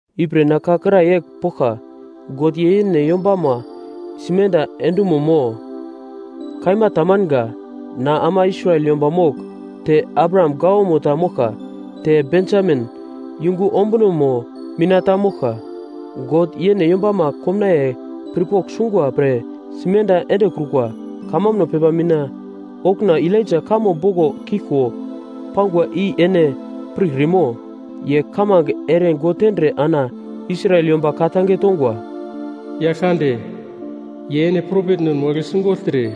Ipre na ka kra yegl poglka: God ye yene yombama simenda endumo mo? Kaima tamanga! Na ama Israel yomba mogl, te Abraham gawamo ta moglka, te Bensamin yungumo ombuno mina ta moglka. God yene yombama komnaiye pirpogl sungwa pre simenda endekrukwa, kamambuno pepa mina okuna Elaija kamo boglo kiglko pangwa i ene pirkrimo? Ye kamange ere God tendre ana Israel yomba ka-tange tongwa, “Yaglkande, ye ene propetnen wagle sigogltre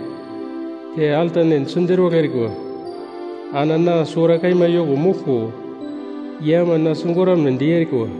te altanen siderwagl erikwa. Ana na suwara kaima yoko moglko ye ama na sigoramnedi erikwa.”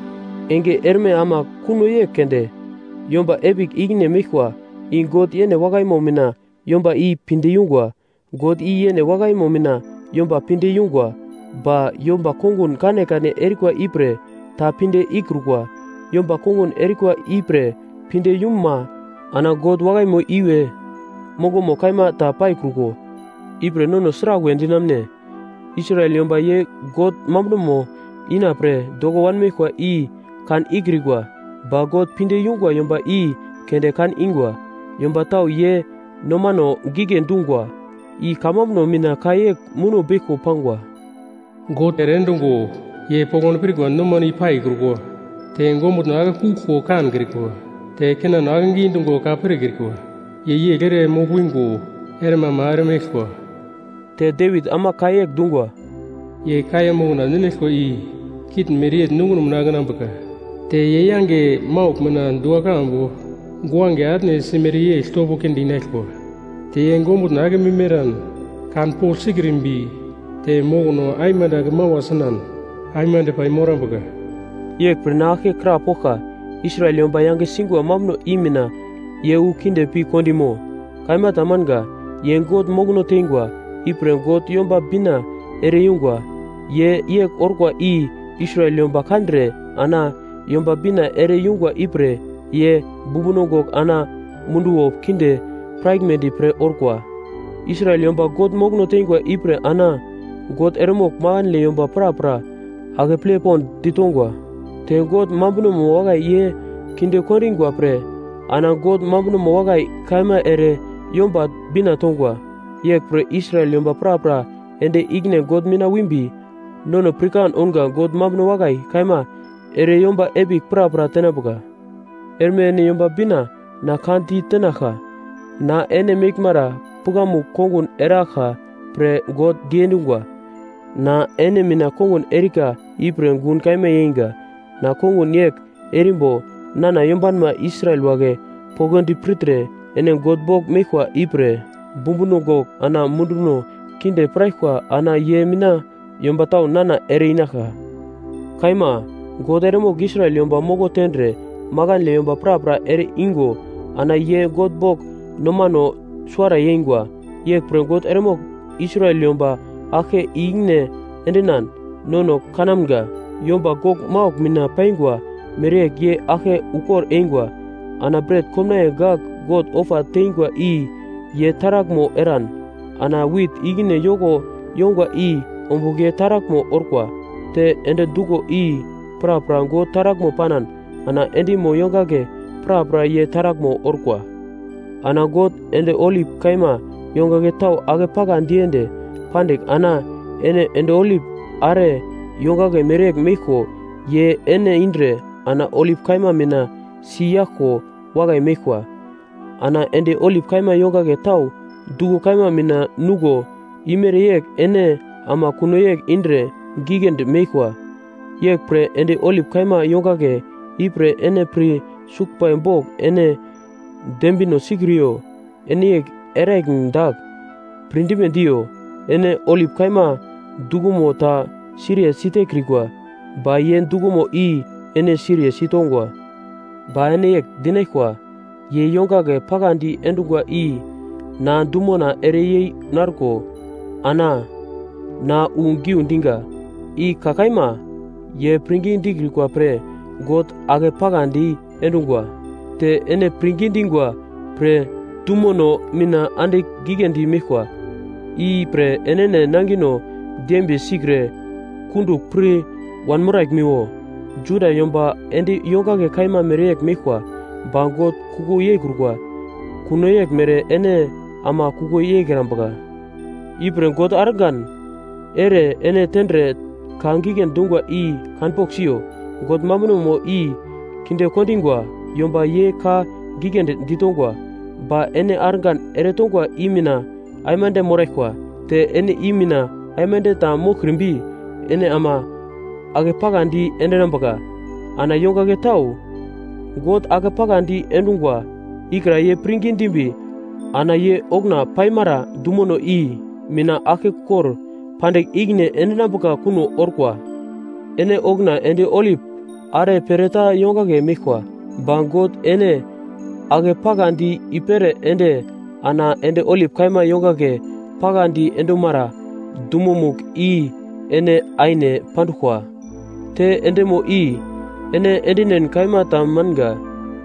Enge erme ama kuno yegl keunde, yomba epigl ikine meglkwa. I God yene wakaimo mina yomba i pinde yungwa. God i yene wakaimo mina yomba pinde yungwa, ba yomba kongun kanekane erikwa ipre ta pinde ikrukwa. Yomba kongun erikwa ipre pinde yuma ana God wakaimo iwe mongomo kaima ta paikruko. Ipre nono sraglwe dinamune? Israel yomba ye God mambunomo inapre doko wanmeglkwa i kan ikrikwa. Ba God pinde yungwa yomba i keunde kan ingwa. Yomba tau ye nomano gigle dungwa, i kamambuno mina ka yegl muno beglko pangwa: “God ere-endungo ye poglodi pirkwa nomano i paikrukwa, te ongumutno akekuglko kankrikwa, te kinano akegi dungo ka pirkrikwa. Ye yegl ere mogl-wingo, erme ama eremeglkwa.” Te Devit ama ka yegl dungwa: “Ye kaiya mokna ninaglkwa i kitn mereyegl nunguno mina akenambuka. Te ye yange maugl mina dua-kambu guange atne simere yegl topo kinde inaglkwa. Te ye ongumutno akemim eran kanpogl sikrimbi te mokono aimande ake mawa sinan aimande paimorambuka.” Yeglpre na aglke krapoglka: Israel yomba yange singwa mambuno i mina ye wu kinde pi kondimo? Kaima tamanga. Ye God mokono teingwa, ipre God Yomba Bina ere-yungwa. Ye yegl orkwa i Israel yomba kandre, ana Yomba Bina ere yungwa ipre ye bumbuno gogl ana munduwo kinde piraglmedi pre orkwa. Israel yomba God mokono teingwa ipre ana God eremogl makandle yomba prapra akeple pond ditongwa. Te God mambunomo wakai ye kinde kondingwa pre ana God mambuno wakai kaima ere Yomba Bina tongwa. Yeglpre Israel yomba prapra ende ikine God mina wimbi, nono pirkan ounga God mambuno wakai kaima ere yomba epigl prapra tenambuka. Erme ene Yomba Bina na ka ditenaglka. Na ene meglmara pukamugl kongun eraglka pre God diendungwa. Na ene mina kongun erika ipre gun kaima yeinga. Na kongun yegl erimbo nana yombanma Israel wagle poglodi pirtre ene God bogl meglkwa ipre bumbuno gogl ana munduno kinde piraglkwa ana ye mina yomba tau nana ere-inaglka. Kaima, God eremogl Israel yomba moko tendre, makandle yomba prapra ere igo ana ye God bogl nomano suwara yeingwa. Yeglpre God eremogl Israel yomba aglke i-ikine endinan, nono kanamga yomba gogl maugl mina paingwa mereyegl ye aglke ukor eingwa. Ana bret komnaiye gagl God ofa tengwa i ye taraglmo eran, ana wit ikine yoko yongwa i ombugl ye taraglmo orkwa. Te endi duglo i prapra God taraglmo panan ana endimo yongagle prapra ye taraglmo orkwa. Ana God, endi olip kaima yongagle tau akepaka diende pandigl ana ene endi olip are yongagle mereyegl meglko ye ene indre ana olip kaima mina si yaglko wakai meglkwa. Ana endi olip kaima yongagle tau duglo kaima mina nuglo imere yegl ene ama kuno yegl indre giglendi meglkwa. Yeglpre endi olip kaima yongagle ipre ene pir suglbai bogl ene dembino sikriyo. Ene yegl eraglim dagl, pirdime diyo: Ene olip kaima duglomo ta siriye sitekrikwa, ba ye duglomo i ene siriye sitongwa. Ba ene yegl dinaglkwa: “Ye yongagle pakadi endungwa i na dumona ereyei narko ana na wu giu diga.” I ka kaima; ye pirngi dikrikwa pre God akepaka diendungwa, te ene pirngi dingwa pre dumono mina andigl giglendi meglkwa. I pre enene nangino dembiye sikre kundugl pir wanmoraglmiwo. Juda yomba endi yongagle kaima mereyegl meglkwa, ba God kuko yeikrukwa. Kuno yeglmere ene ama kuko yeikrambuka. Ipre God argan ere ene tendre ka giglendi dungwa i kanpogl siyo, God mambunomo i kinde kondingwa yomba ye ka giglendi ditongwa. Ba ene argan eretongwa i mina aimande moraglkwa. Te ene i mina aimande ta moglkrimbi ene ama akepakadi endinambuka. Ana yongagle tau God akepakadi endungwa ikra ye pirngi dimbi ana ye okuna paimara dumono i mina aglkekor pandigl ikine endinambuka kuno orkwa. Ene okuna endi olip are pereta yongagle meglkwa, ba God ene ake pakadi i-pere ende ana endi olip kaima yongagle pakadi endumara dumomugl i ene aine panduglkwa. Te endimo i ene endinen kaima tamanga.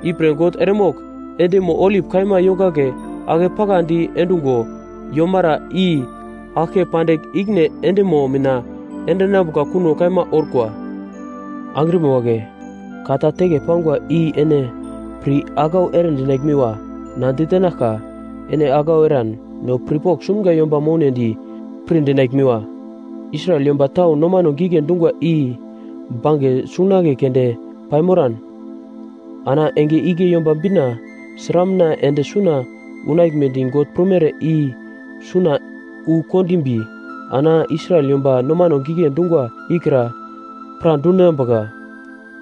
Ipre God eremogl endimo olip kaima yongagle ake pakadi endungo yomara i aglke pandigl ikine endimo mina endinambuka kuno kaima orkwa. Angrima wagle, ka ta teke pangwa, i ene pir aglau eredinaglmiwo na ditenaglka. Ene aglau eran no pirpogl sumga yomba mounedi pirdinaglmiwa: Israel yomba tau nomano gigle dungwa i bange sungunagle keunde paimoran, ana enge igle Yomba Bina sramuna ende suna unaglmedi God prumere i suna wu kondimbi ana Israel yomba nomano gigle dungwa ikra pradundinambuka.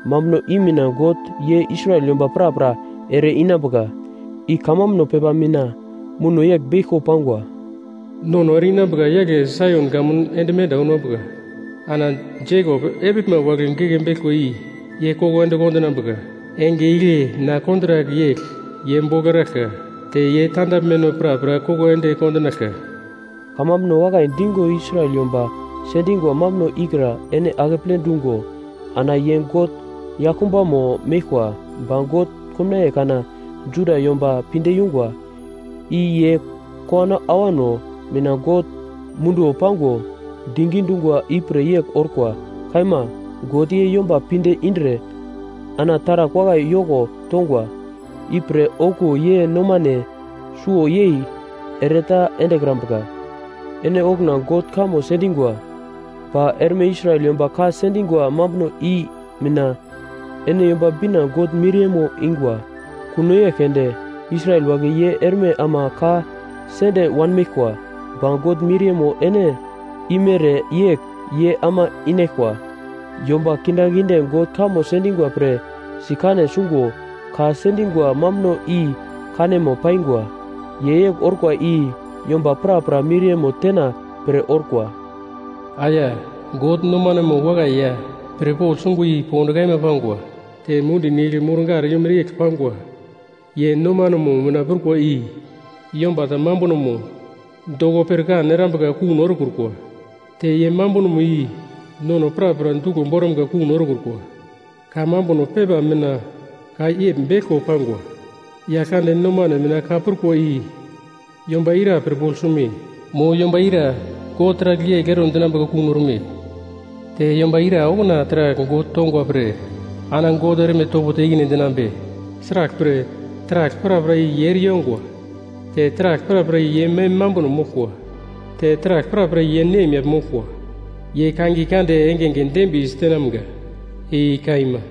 Mambuno i mina God ye Israel yomba prapra ere-inambuka, i kamambuno pepa mina muno yegl beglko pangwa: “Nono ere-inambuka yagle Saion kamun ende menda unambuka, ana Jekop epiglma wagle geke beglkwa i ye koko ende kondinambuka. Enge igle na kontrak yegl ye bogl eraglka, te ye tandaglmeno prapra koko ende kondinaglka.” Kamambuno wakai dingo Israel yomba sendingwa mambuno ikra ene akeple dungo ana ye God yaglkumbamo meglkwa. Ba God komnaiye kana Juda yomba pinde yungwa, i ye kowano awano mina God munduwo pango digi dungwa ipre yegl orkwa. Kaima. God ye yomba pinde indre ana taragl wakai yoko tongwa, ipre okuwo ye nomane suwo yei ere ta endekrambuka. Ene okuna God kamo sendingwa, ba erme Israel yomba ka sendingwa mambuno i mina ene Yomba Bina God miriyemo ingwa. Kuno yegl keunde, Israel wagle ye erme ama ka sende wanmeglkwa, ba God miriyemo ene imere yegl ye ama inaglkwa. Yomba kindaginde God kamo sendingwa pre sikane sungo ka sendingwa mambuno i kanemo paingwa. Ye yegl orkwa i yomba prapra miriyemo tena pre orkwa. Aya! God nomanemo wakai ya pirpogl sungwa i pond kaima pangwa. Te mundi nigl mur-gar yomere yegl pangwa. Ye nomanemo mina prukwa i yomba ta mambunomo doko pirkan erambuka kuno erekrukwa! Te ye mambunomo i nono prapra duglo boramga kuno erekrukwa! Kamambuno pepa mina ka yegl beglko pangwa: “Yaglkande nomane mina ka prukwa i yomba ira pirpogl sume? Mo yomba ira God taragl yegl ero dinambuka kuno orme?” Te, “Yomba ira okuna taragl God tongwa pre ana God erme topo te ikine endinambe?” Sraglpre, taragl prapra i ye ere yongwa, te taragl prapra ye mem mambuno moglkwa, te taragl prapra ye nemyagl moglkwa. Ye kangiye kande engenge dembiye sitenamga! I kaima.